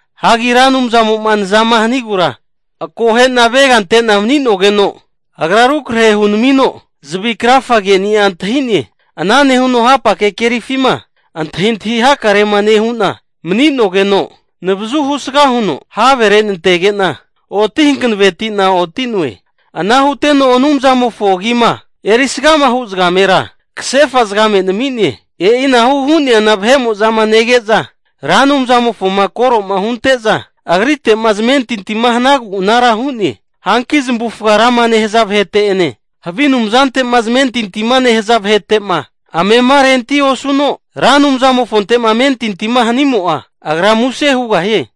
Hagi Ra Anumzamo'ma nzama hanigura akohe'na avega ante'na mani'nogeno, Agra rukrahe hunamino zavi krafageni'a antahi'ne. Ana nehuno hapake kerifima antahintahi hakarema nehu'na mani'nogeno, navazu husga huno havere nantege'na, oti hankaveti'na oti'noe. Ana huteno Anumzantimofo agima erisgama hu' zagamera kasefa zagame nami'ne. E'ina hu'neana vahe'mo'zama nege'za Ra Anumzamofoma koro'ma hunte'za Agrite'ma zamentintima hanagu anara hu'ne. Hanki zamavufaga rama nehaza vahete'ene havi anumzante'ma zamentintima nehaza vahete'ma amema renti osuno, Ra Anumzamofonte'ma amentintima hanimo'a, agra muse hugahie.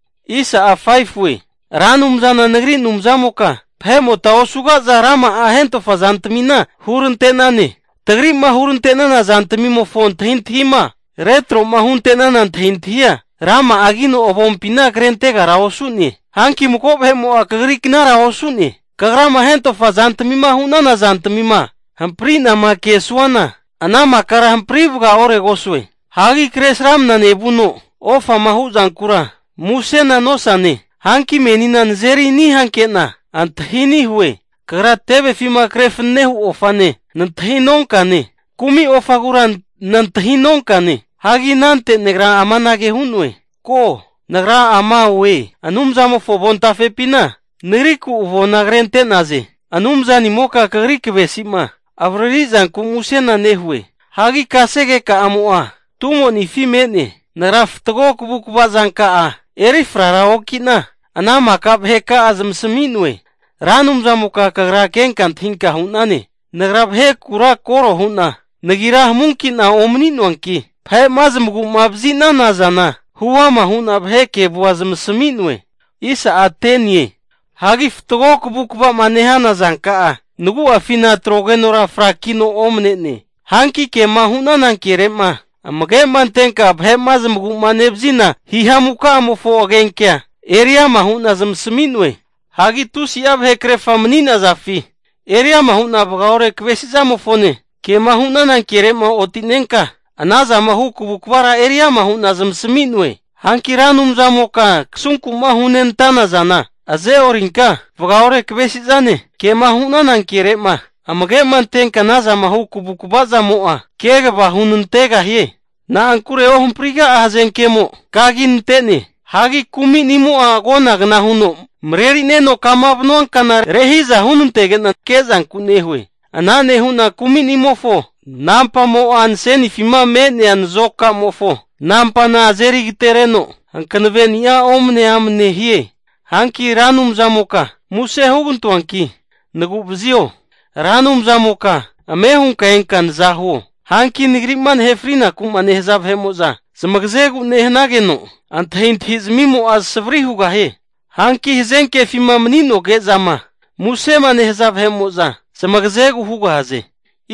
Ra Anumzana nagri Anumzamoka vahe'mota osugaza rama'a hentofa zantamina hurante'nane. Tagri'ma hurante'nana zantmimofo antahintahima retro'ma huntenana antahintahia, rama'agino avompina krentegara osu'ne. Hanki mago vahe'mo'a kagri knara osu'ne. Kagrama hentofa zantmima hu'nana zantmima hampri'nama kesuana ana makara hampri vagaoregosue. Hagi kresramnama nevuno ofama hu zankura musena nosane. Hanki menina nazeri ani hanke'na antahi ani' hue. Kagra tevefima kre fananehu ofane kumi ofagura nantahinonkane. Hagi anante nagra amanage hu'noe, ko, Nagra ama oe. Anumzamofo avontafepina nagriku hu'za avona krente'naze. Anumzanimoka kagri kavesi'ma avaririzanku muse nehue. Hagi kasegeka'amo'a tumonifi me'ne. Nagra fatgo kavukava zanka'a eri fraraoki'na, ana maka vaheka'a zamasami'noe. Ra Anumzamoka Kagra kenka antahinka hu'nane, nagra vahekura korora hu'na nagira hamunki'na omani'noanki vahe'ma zmagu'ma vazi'nana zana huama hu'na vahe kevua zamasmi'noe. Hagi fatgo kavukava'ma nehana zanka'a nagu'afina atrogenora frakino omne'ne. Hanki kema hu'nana kere'ma amage'ma antenka vahe'ma zamagu'ma nevazina hihamuka'amofo agenkea eriama hu'na zamasmi'noe. Hagi tusi'a vahekrerfa mani'nazafi eriama hu'na vagaore kavesi zamofone, kema hu'nana kere'ma otinenka ana zama hu kavukavara eriama hu'na zamasmi'noe. Hanki Ra Anumzamoka, kasunkuma hunenantana zana azeorinka, vagaore kavesizane ke'ma hunana kere'ma amage'ma antenka ana zama hu kavukava zamo'a kegava hunantegahie. Na'ankure ohampriga'a hazenkemo kaginante'ne. Hagi kuminimo'a agonagna huno marerineno kama vanuankana rehiza hunantenege'na, ke'zanku nehue. Ana nehu'na kuminimofo nampamo'a nasenifima me'nea zamo'a nazokamofo nampana azeri agateregeno hankaveni'a omne amne hie. Hanki Ra Anumzamoka muse hugantoanki nagu'vazio! Ra Anumzamoka ame hunka enka nazahuo! Hanki nagri'ma nahe frinaku'ma nehaza vahe'mo'za zamagazegu nehanageno antahintahizmimo'a savari hugahie. Hanki hazenkefima mani'noge'zama musema nehaza vahe'mo'za zamagazegu hugahaze.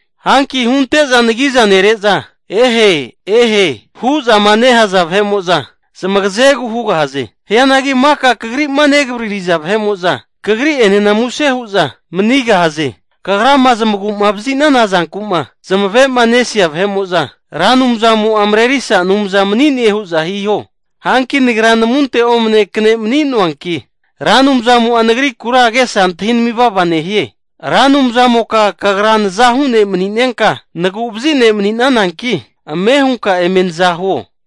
Hanki hunte'za nagiza nere'za, ehe ehe! hu'zama nehaza vahe'mo'za zamagazegu hugahaze. Hianagi maka vahe'mo'za Kagri'ma negavaririza vahe'mo'za Kagri'enena muse hu'za manigahaze. Kagrama zamagu'mavazi'nana zanku'ma zamave'nesia vahe'mo'za, Ra Anumzamo'a marerisa Anumza mani'ne hu'za hiho. Hanki nagra namunte omne kne mani'noankino, Ra Anumzamo'a nagrikura agesa antahinami vava nehie. Ra Anumzanimoka Kagra nazahu ne'maninka nagu'vazi ne' mani'nananki, ame hunka eme nazahuo.